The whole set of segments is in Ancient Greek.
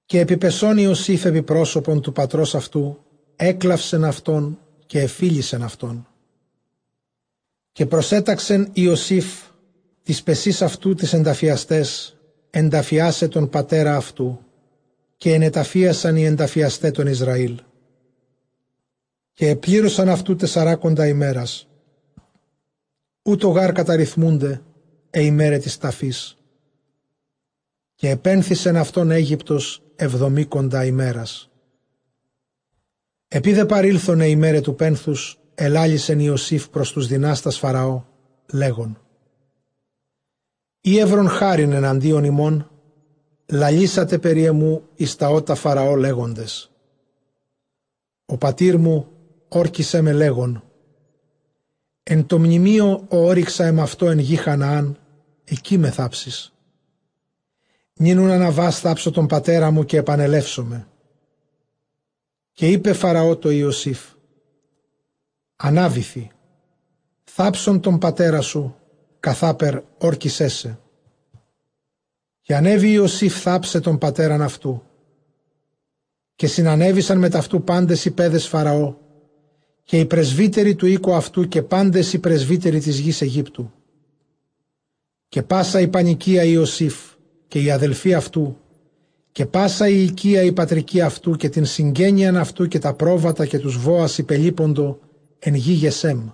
Καὶ ἐπιπεσὼν Ἰωσὴφ ἐπὶ πρόσωπον τοῦ πατρὸς αὐτοῦ ἔκλαυσεν αὐτὸν, καὶ ἐφίλησεν αὐτόν. Καὶ προσέταξεν Ἰωσὴφ τοῖς παισὶν αὐτοῦ τοῖς ἐνταφιασταῖς, ἐνταφιάσαι τὸν πατέρα αὐτοῦ· καὶ ἐνεταφίασαν οἱ ἐνταφιασταὶ τὸν Ἰσραήλ. Καὶ ἐπλήρωσαν αὐτοῦ τεσσαράκοντα ἡμέρας· οὕτω γὰρ καταριθμοῦνται αἱ ἡμέραι τῆς ταφῆς· καὶ ἐπένθησεν αὐτὸν Αἴγυπτος ἑβδομήκοντα ἡμέρας. Ἐπεὶ δὲ παρῆλθον αἱ ἡμέραι τοῦ πένθους, ἐλάλησεν Ἰωσὴφ πρὸς τοὺς δυνάστας Φαραὼ, λέγων, εἰ εὗρον χάριν ἐναντίον ὑμῶν, λαλήσατε περὶ ἐμοῦ εἰς τὰ ὦτα Φαραὼ, λέγοντες, ὁ πατήρ μου ὥρκισέ με, λέγων, ἐν τῷ μνημείῳ, ᾧ ὤρυξα ἐμαυτῷ ἐν γῇ Χαναὰν, ἐκεῖ με θάψεις· νῦν οὖν ἀναβὰς· θάψω τὸν πατέρα μου, καὶ ἐπανελεύσομαι· Καὶ εἶπε Φαραὼ τῷ Ἰωσὴφ, ἀνάβηθι, θάψον τὸν πατέρα σου, καθάπερ ὥρκισέ σε. Καὶ ἀνέβη Ἰωσὴφ θάψαι τὸν πατέρα αὐτοῦ· καὶ συνανέβησαν μετʼ αὐτοῦ πάντες οἱ παῖδες Φαραὼ, καὶ οἱ πρεσβύτεροι τοῦ οἴκου αὐτοῦ, καὶ πάντες οἱ πρεσβύτεροι τῆς γῆς Αἰγύπτου, καὶ πᾶσα ἡ πανοικία Ἰωσὴφ, καὶ οἱ ἀδελφοὶ αὐτοῦ, καὶ πᾶσα ἡ οἰκία ἡ πατρικὴ αὐτοῦ, καὶ ἡ συγγένεια αὐτοῦ· καὶ τὰ πρόβατα, καὶ τοὺς βόας ὑπελίποντο ἐν γῇ Γεσέμ.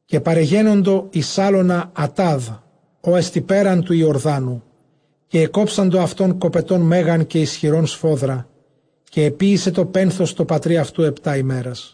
Καὶ παρεγένοντο εἰς ἅλωνα Ἀτὰδ, ὅ ἐστι πέραν τοῦ Ἰορδάνου· καὶ ἐκόψαντο αὐτὸν κοπετὸν μέγαν καὶ ἰσχυρὸν σφόδρα· καὶ ἐποίησε τὸ πένθος τῷ πατρὶ αὐτοῦ ἑπτὰ ἡμέρας.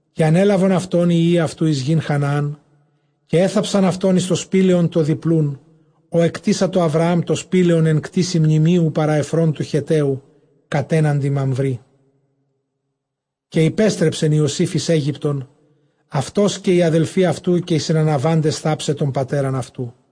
Καὶ ἀνέλαβον αὐτὸν οἱ υἱοὶ αὐτοῦ εἰς γῆν Χαναάν· καὶ ἔθαψαν αὐτὸν εἰς τὸ σπήλαιον τὸ διπλοῦν, ὃ ἐκτήσατο Ἁβραὰμ τὸ σπήλαιον ἐν κτήσει μνημείου παρὰ Ἐφρὼν τοῦ Χετταίου, κατέναντι Μαμβρή. Καὶ ὑπέστρεψεν Ἰωσὴφ εἰς Αἴγυπτον, αὐτὸς καὶ οἱ ἀδελφοὶ αὐτοῦ, καὶ οἱ συναναβάντες θάψαι τὸν πατέρα αὐτοῦ.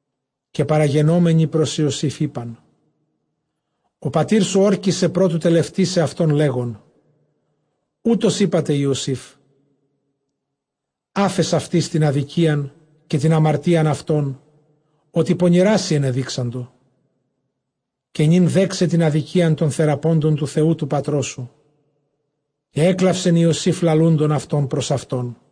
Καὶ παραγενόμενοι πρὸς Ἰωσὴφ εἶπαν, ὁ πατήρ σου ὥρκισε πρὸ τοῦ τελευτῆσαι αὐτὸν, λέγων, οὕτως εἴπατε Ἰωσήφ· ἄφες αὐτοῖς τὴν ἀδικίαν καὶ τὴν ἁμαρτίαν αὐτῶν, ὅτι πονηρά σοι ἐνεδείξαντο· καὶ νῦν δέξαι τὴν ἀδικίαν τῶν θεραπόντων τοῦ Θεοῦ τοῦ πατρός σου· καὶ ἔκλαυσεν Ἰωσὴφ λαλούντων αὐτῶν πρὸς αὐτόν.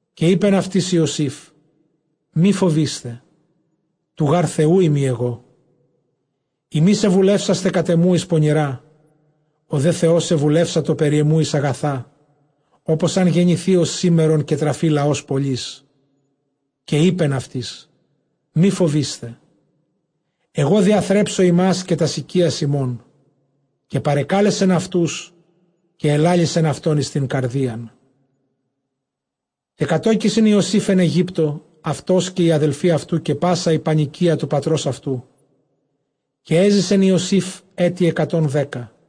Καὶ εἶπεν αὐτοῖς Ἰωσὴφ, μὴ φοβεῖσθε, τοῦ γὰρ Θεοῦ εἰμι ἐγώ. Ὑμεῖς ἐβουλεύσασθε κατʼ ἐμοῦ εἰς πονηρὰ, ὁ δὲ Θεὸς ἐβουλεύσατο περὶ ἐμοῦ εἰς ἀγαθὰ, ὅπως ἂν γενηθῇ ὡς σήμερον, καὶ τραφῇ λαὸς πολύς. Καὶ εἶπεν αὐτοῖς, μὴ φοβεῖσθε· ἐγὼ διαθρέψω ὑμᾶς, καὶ τὰς οἰκίας ὑμῶν· καὶ παρεκάλεσεν αὐτοὺς, καὶ ἐλάλησεν αὐτῶν εἰς τὴν καρδίαν. Καὶ κατῴκησεν Ἰωσὴφ ἐν Αἰγύπτῳ, αὐτὸς καὶ οἱ ἀδελφοὶ αὐτοῦ, καὶ πᾶσα ἡ πανοικία τοῦ πατρὸς αὐτοῦ· καὶ ἔζησεν Ἰωσὴφ ἔτη ἑκατὸν δέκα.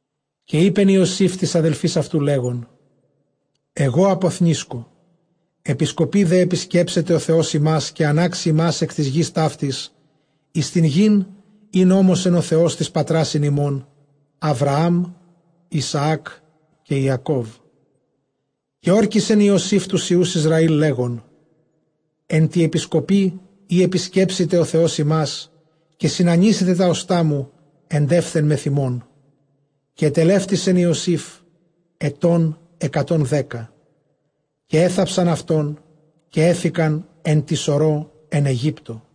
Καὶ εἶπεν Ἰωσὴφ τοῖς ἀδελφοῖς αὐτοῦ, λέγων, ἐγὼ ἀποθνήσκω· ἐπισκοπῇ δὲ ἐπισκέψεται ὁ Θεὸς ὑμᾶς, καὶ ἀνάξει ὑμᾶς ἐκ τῆς γῆς ταύτης εἰς τὴν γῆν, ἣν ὤμοσεν ὁ Θεὸς τοῖς πατράσιν ἡμῶν, Ἁβραὰμ, Ἰσαὰκ, καὶ Ἰακώβ. Καὶ ὥρκισεν Ἰωσὴφ τοὺς υἱοὺς Ἰσραὴλ, λέγων, ἐν τῇ ἐπισκοπῇ ᾗ ἐπισκέψηται ὁ Θεὸς ὑμᾶς, καὶ συνανοίσετε τὰ ὀστᾶ μου ἐντεῦθεν μεθʼ ὑμῶν. Καὶ ἐτελεύτησεν Ἰωσὴφ ἐτῶν ἑκατὸν δέκα· καὶ ἔθαψαν αὐτὸν, καὶ ἔθηκαν ἐν τῇ σορῷ ἐν Αἰγύπτῳ.